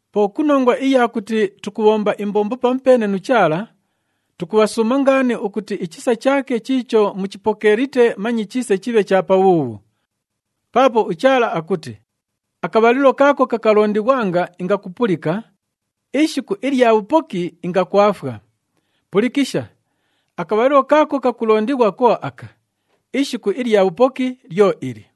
Po ku nongwa iya kuti tukubhomba imbombo pamupeene nu Chaala, tukubhasuuma ngaani ukuti ichisa chaake chiicho muchipokeelite manye chiise chibhe cha pabhuubhu. Paapo uChaala akuti, “Akabhalilo kaako kakalondighwanga, ingakupulika, ishiku ilya bhupoki, ingakwafwa.” Pulikisha, akabhalilo kaako kakulondighwa ko aka, ishiku ilya bhupoki lyo ili!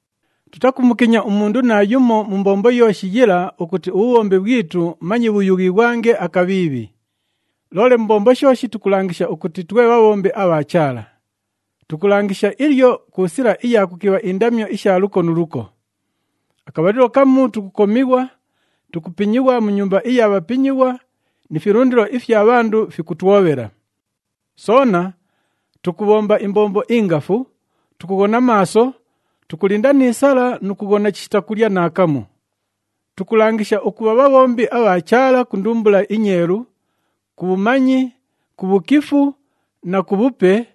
Tutakumukinya umundu naayumo mu mbombo yooshi yila ukuti ubhubhombi bhwitu manye bhuyughighwange akabhiibhi. Loole mu mbombo shooshi tukulangisha ukuti twe bhabhombi abha Chaala. Tukulangisha ilyo ku sila iya kukibha indamyo isha luko nu luko. Akabhalilo kamu tukukomighwa, tukupinyighwa mu nyumba iya bhapinyighwa ni filundilo ifya bhandu fikutwobhela. Soona tukubhomba imbombo ingafu, tukughona maaso, tukulinda ni sala nu kughona chishita kulya naakamu. Tukulangisha ukubha bhabhombi abha Chaala ku ndumbula inyeelu, ku bhumanyi, ku bhukifu na ku bhupe,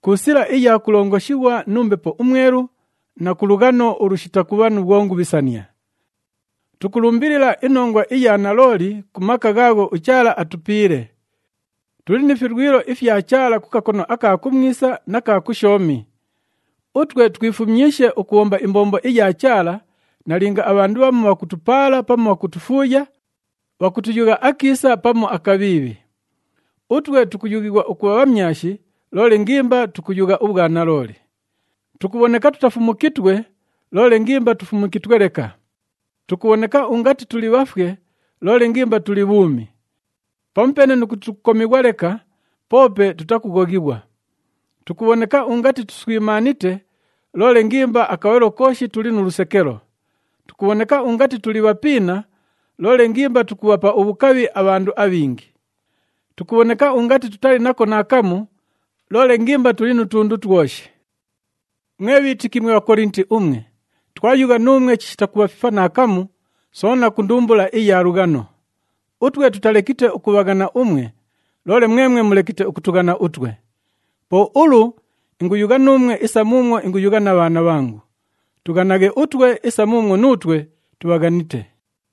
ku sila iya kulongoshighwa nu Mbepo uMwelu na ku lughano ulushita kubha nu bhwongubhisania. Tukulumbilila inongwa iya nalooli ku maka ghaagho uChaala atupiile. Tuli ni filwilo ifya Chaala ku kakono aka kumwisa na ka kushoomi. Utwe twifumyishe ukubhomba imbombo iya Chaala, nalinga abhandu bhamu bhakutupaala pamu bhakutufuuya, bhakutuyugha akiisa pamu akabhiibhi. Utwe tukuyughighwa ukubha bhamyashi, loole ngimba tukuyugha ubhwanalooli. Tukubhoneka tutafumukitwe, loole ngimba tufumukitwe leka. Tukubhoneka ungati tuli bhafwe, loole ngimba tuli bhuumi. Pamupeene nu kuti tukukomighwa leka, poope tutakughoghighwa. Tukubhoneka ungati tuswimaanite, loole ngimba akabhalilo kooshi tuli nu lusekelo. Tukubhoneka ungati tuli bhapiina, loole ngimba tukubhapa ubhukabhi abhandu abhingi. Tukubhoneka ungati tutali nako naakamu, loole ngimba tuli nu tundu twoshi. Mwe bhiitiki mwe Bhakolinti umwe, twayugha nuumwe chishita kubhafifa naakamu, soona ku ndumbula iya lughano. Utwe tutalekite ukubhaghana umwe, loole mwemwe mulekite ukutughana utwe. Po ulu inguyugha nuumwe isa muumwo inguyugha na bhaana bhangu. Tughanaghe utwe isa muumwo nuutwe tubhaghanite.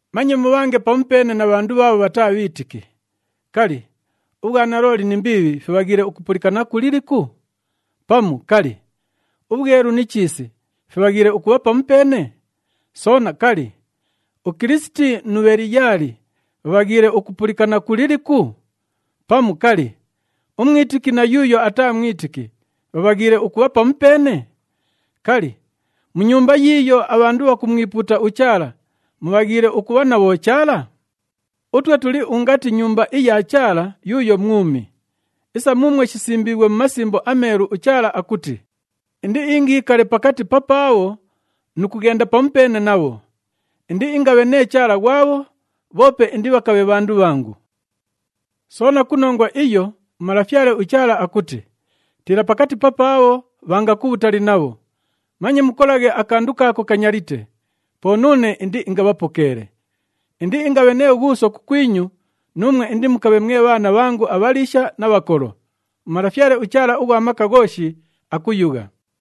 Manye mubhange pamupeene na bhandu bhaabho bhataa bhiitiki. Kali, ubhwanalooli ni mbiibhi fibhaghiile ukupulikana ku liliku? Pamu, kali, ubhwelu ni chiisi fibhaghiile ukubha pamupeene? Soona, kali, uKilisiti nu Bheliyaali bhabhaghiile ukupulikana ku liliku? Pamu, kali, umwitiki na yuuyo ataa mwitiki bhabhaghiile ukubha pamupeene? Kali, mu Nyumba yiiyo abhandu bhakumwipuuta uChaala mubhaghiile ukubha na bhochaala? Utwe tuli ungati Nyumba iya Chaala yuuyo mwumi. Isa muumwo shisimbiighwe mu Masimbo aMeelu, uChaala akuti, “Indiingiikale pakati papaabho nu kughenda pamupeene nabho. Indiingabhe nee Chaala ghwabho, bhoope indibhakabhe bhandu bhangu.” Soona ku nongwa iyo, uMalafyale uChaala akuti, “Tiila pakati papaabho, bhanga kubhutali nabho. Manye mukolaghe akandu kaako kanyalite, po nuune indiingabhapokeele.” “Indiingabhe nee Ghuuso kukwinyu, nuumwe indimukabhe mwe bhaana bhangu abhaliisha na bhakolo.” UMalafyale uChaala ughwa Maka Ghooshi, akuyugha!